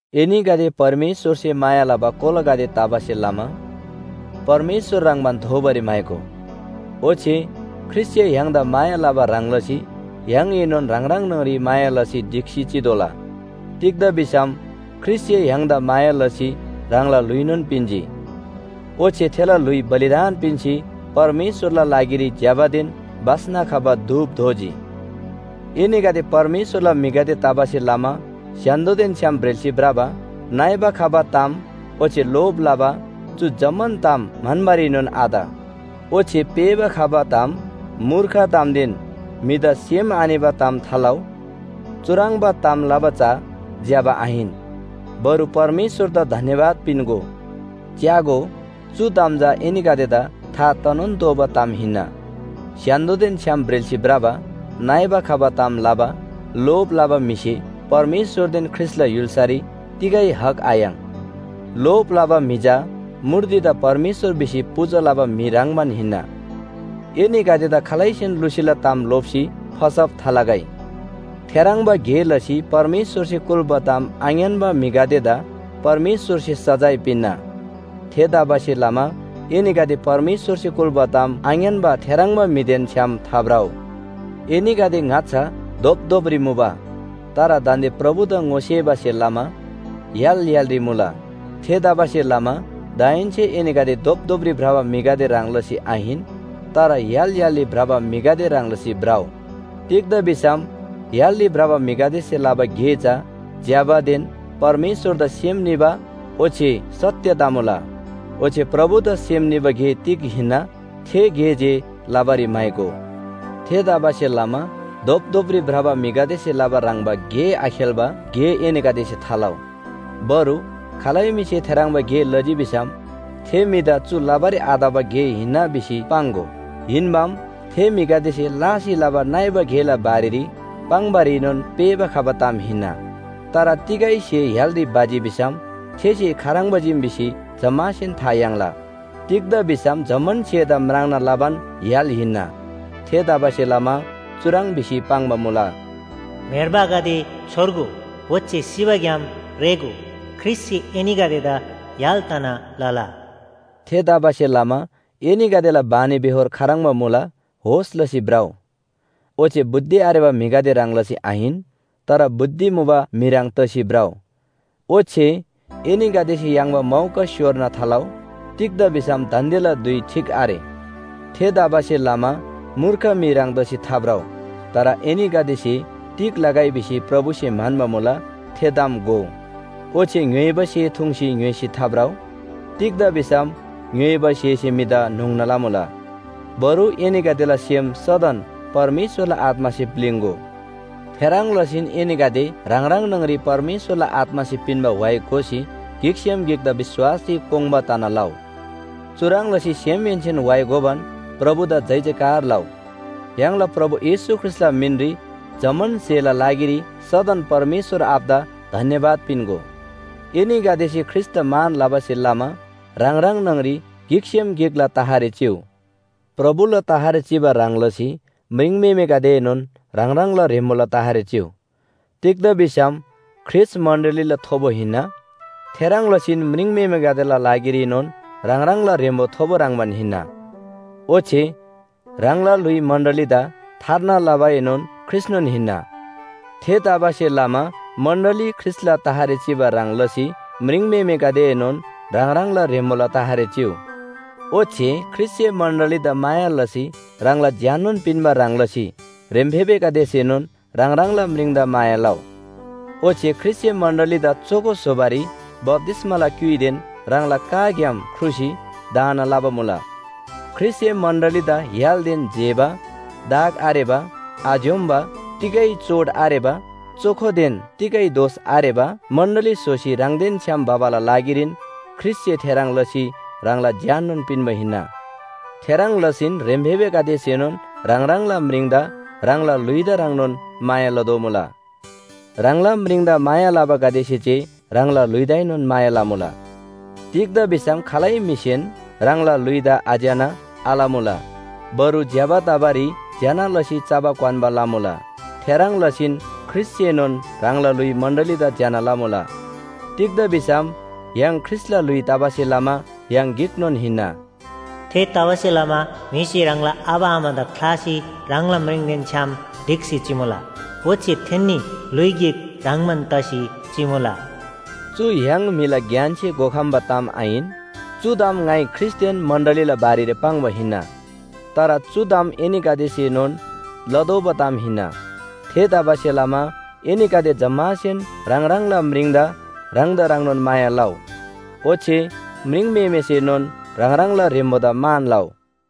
एनीगदे परमेश्‍वरसे माया लबा कोलागदे तबासे लमा परमेश्‍वर ह्रङ्‌बान दोबारी म्‍हाइगो। ओच्‍छे ख्रीष्‍टसे य्‍हाङदा माया लबा ह्रङ् लसी य्‍हाङएनोन ह्राङ ह्राङ न्‍हङरी माया लसी ढिक्‍सी चितोःला। तिग्‍दा भिसम ख्रीष्‍टसे य्‍हाङदा माया लसी ह्राङला ल्‍हुइनोन पिन्‍जी। ओच्‍छे थेला ल्‍हुइ बलिदान पिन्‍सी परमेश्‍वरला लागिरी ज्‍यबादेन बास्‍ना खबा धूप दोजी। एनीगदे परमेश्‍वरला म्‍हिगदे तबासे लमा स्‍य्‍हान्‍दोदेन छ्‌याम ब्रेल्‍सी भ्रबा, नइबा खबा ताम ओच्‍छे लोभ लबा, चु जम्‍मान ताम म्‍हन्‍बारीनोन आत। ओच्‍छे पेःबा खबा ताम, मूर्ख तामदेन म्‍हिदा सेम आनिबा ताम थालउ। चुह्रङ्बा ताम लबा चा ज्‍यबा आहिन। बरु परमेश्‍वरदा धन्‍यवाद पिन्‍गो। च्‍यागो, चु ताम चा एनीगदेदा था तनोन तोःबा ताम हिन्‍ना। स्‍य्‍हान्‍दोदेन छ्‌याम ब्रेल्‍सी भ्रबा, नइबा खबा ताम लबा, लोभ लबा म्‍हिसे परमेश्‍वरदेन ख्रीष्‍टला य्‍हुल्‍सारी तिगै हक आयाङ्। लोभ लबा म्‍हि चा मूर्तिदा परमेश्‍वर भिसी पूजा लबा म्‍हि ह्रङ्‌बान हिन्‍ना। एनीगदेदा खालैसेन लुसीला ताम लोप्‍सी फसब थालगै। थेह्रङ्बा गे लसी परमेश्‍वरसे कुल्‍बा ताम आङ्‌यान्‍बा म्‍हिगदेदा परमेश्‍वरसे सजाय पिन्‍ना। थेतबासेलमा एनीगदे परमेश्‍वरसे कुल्‍बा ताम आङ्‌यान्‍बा थेह्रङ्बा म्‍हिदेन छ्‌याम थाभ्रउ। एनीगदे ङाच्‍छा धोपधोपरी मुबा। तर दान्‍दे प्रभुदा ङोसेबासे लमा य्‍हाल य्‍हालरी मुला। थेतबासेलमा दाहेन्‍से एनीगदे धोपधोपरी भ्रबा म्‍हिगदे ह्रङ् लसी आहिन तर य्‍हाल य्‍हालरी भ्रबा म्‍हिगदे ह्रङ् लसी भ्रउ। तिग्‍दा भिसम य्‍हालरी भ्रबा म्‍हिगदेसे लबा गे चा ज्‍यबादेन परमेश्‍वरदा सेम निबा ओच्‍छे सत्‍य तमुला। ओच्‍छे प्रभुदा सेम निबा गे तिग हिन्‍ना? थे गे जे लबारी म्‍हाइगो। थेतबासेलमा धोपधोपरी भ्रबा म्‍हिगदेसे लबा ह्रङ्‌बा गे आखेल्‍बा गे एनीगदेसे थालउ। बरु खालै म्‍हिसे थेह्रङ्बा गे लजी भिसम थे म्‍हिदा चु लबारी आतबा गे हिन्‍ना भिसी पाङ्‍गो। हिन्‍बाम, थे म्‍हिगदेसे लासी लबा नइबा गेला बारेरी पाङ्‌बारीनोन पेःबा खबा ताम हिन्‍ना। तर तिगै स्‍हे य्‍हालरी भजी भिसम थे स्‍हे खाह्रङ्बा चीम भिसी जम्‍मासेन था याङ्ला। तिग्‍दा भिसम जम्‍मान स्‍हेदा म्राङ्ना लबान य्‍हाल हिन्‍ना। थेतबासेलमा चुह्रङ् भिसी पाङ्बा मुला, “म्‍हेर्बागदे छोर्गो, ओच्‍छे सिबाग्‍याम रेःगो! ख्रीष्‍टसे एनीगदेदा य्‍हाल तना लला।” थेतबासेलमा एनीगदेला बानीबेहोर खाह्रङ्बा मुला होस लसी भ्रउ। ओच्‍छे बुद्धि आरेबा म्‍हिगदे ह्रङ् लसी आहिन तर बुद्धि मुबा म्‍हि ह्रङ् तसी भ्रउ। ओच्‍छे एनीगदेसे याङ्बा मौका स्‍योर्ना थालउ। तिग्‍दा भिसम दान्‍देला धुइ ठीक आरे। थेतबासेलमा मूर्ख म्‍हि ह्रङ् तसी थाभ्रउ। तर एनीगदेसे तिग लगै भिसी प्रभुसे म्‍हन्‍बा मुला थे ताम घोउ। ओच्‍छे ङ्‌य्‍होइबा स्‍हे थुङ्सी ङ्‌य्‍होइसी थाभ्रउ। तिग्‍दा भिसम ङ्‌य्‍होइबा स्‍हेसे म्‍हिदा न्‍होङ्ना लमुला। बरु एनीगदेला सेम सदन परमेश्‍वरला आत्‍मासे प्‍लिङ्‍गो। थेह्रङ् लसीन एनीगदे ह्राङ ह्राङ न्‍हङरी परमेश्‍वरला आत्‍मासे पिन्‍बा व्‍हाइ गोसी गिकसेम गिकदा विश्‍वासरी कोङ्बा तना लउ। चुह्रङ् लसी सेमहेन्‍सेन व्‍हाइ गोबान प्रभुदा जयजयकार लउ। य्‍हाङला प्रभु येशू ख्रीष्‍टला मिनरी जम्‍मान स्‍हेला लागिरी सदन परमेश्‍वर आबादा धन्‍यवाद पिन्‍गो। एनीगदेसे ख्रीष्‍टदा मान लबासे लमा ह्राङ ह्राङ न्‍हङरी गिकसेम गिकला तहरी चिउ। प्रभुला तहरी चिबा ह्रङ् लसी म्रिङम्‍हेमेगदेएनोन ह्राङ ह्राङला ह्रेम्‍बोला तहरी चिउ। तिग्‍दा भिसम ख्रीष्‍ट मण्‍डलीला थोबो हिन्‍ना। थेह्रङ् लसीन म्रिङम्‍हेमेगदेला लागिरीनोन ह्राङ ह्राङला ह्रेम्‍बो थोबो ह्रङ्‌बान हिन्‍ना। ओच्‍छे ह्राङला ल्‍हुइ मण्‍डलीदा थार्ना लबाएनोन ख्रीष्‍टनोन हिन्‍ना। थेतबासेलमा मण्‍डली ख्रीष्‍टला तहरी चिबा ह्रङ् लसी म्रिङम्‍हेमेगदेएनोन ह्राङ ह्राङला ह्रेम्‍बोला तहरी चिउ। ओच्‍छे ख्रीष्‍टसे मण्‍डलीदा माया लसी ह्राङला ज्‍याननोन पिन्‍बा ह्रङ् लसी ह्रेम्‍फेबेगदेसेनोन ह्राङ ह्राङला म्रिङदा माया लउ। ओच्‍छे ख्रीष्‍टसे मण्‍डलीदा चोखो स्‍होबारी बप्‍तिस्‍माला क्‍युइदेन ह्राङला बचनग्‍याम ख्रुसी धाना लबा मुला। ख्रीष्‍टसे मण्‍डलीदा य्‍हालदेन जेबा, दाग आरेबा, आज्‍योम्‍बा, तिगै चोट आरेबा, चोखोदेन तिगै दोष आरेबा मण्‍डली स्‍होसी ह्राङदेन छ्‌याम भबाला लागिरीन ख्रीष्‍टसे थेह्रङ् लसी ह्राङला ज्‍याननोन पिन्‍बा हिन्‍ना। थेह्रङ् लसीन ह्रेम्‍फेबेगदेसेनोन ह्राङ ह्राङला म्रिङदा ह्राङला ल्‍हुइदा ह्रङ्नोन माया लदोमुला। ह्राङला म्रिङदा माया लबागदेसे जे ह्राङला ल्‍हुइदाएनोन माया लमुला। तिग्‍दा भिसम खालै म्‍हिसेन ह्राङला ल्‍हुइदा आज्‍यना आलमुला। बरु ज्‍यबा तबारी ज्‍यना लसी चबा क्‍वान्‍बा लमुला। थेह्रङ् लसीन ख्रीष्‍टसेनोन ह्राङला ल्‍हुइ मण्‍डलीदा ज्‍यना लमुला। तिग्‍दा भिसम य्‍हाङ ख्रीष्‍टला ल्‍हुइ तबासे लमा य्‍हाङ गिकनोन हिन्‍ना। “थेतबासेलमा म्‍हिसे ह्राङला आबा आमादा ख्‍लासी ह्राङला म्रिङदेन छ्‌याम ढिक्‍सी चिमुला। ओच्‍छे थेन्‍नी ल्‍हुइ गिक ह्रङ्‌बान तसी चिमुला।” चु य्‍हाङ म्‍हिला ज्ञानसे घोखम्‍बा ताम आहिन। चु ताम ङाइ ख्रीष्‍टदेन मण्‍डलीला बारेरी पाङ्बा हिन्‍ना। तर चु ताम एनीगदेसेनोन लतोःबा ताम हिन्‍ना। थेतबासेलमा एनीगदे जम्‍मासेन ह्राङ ह्राङला म्रिङदा ह्राङदा ह्रङ्नोन माया लउ, ओच्‍छे म्रिङम्‍हेमेसेनोन ह्राङ ह्राङला ह्रेम्‍बोदा मान लउ।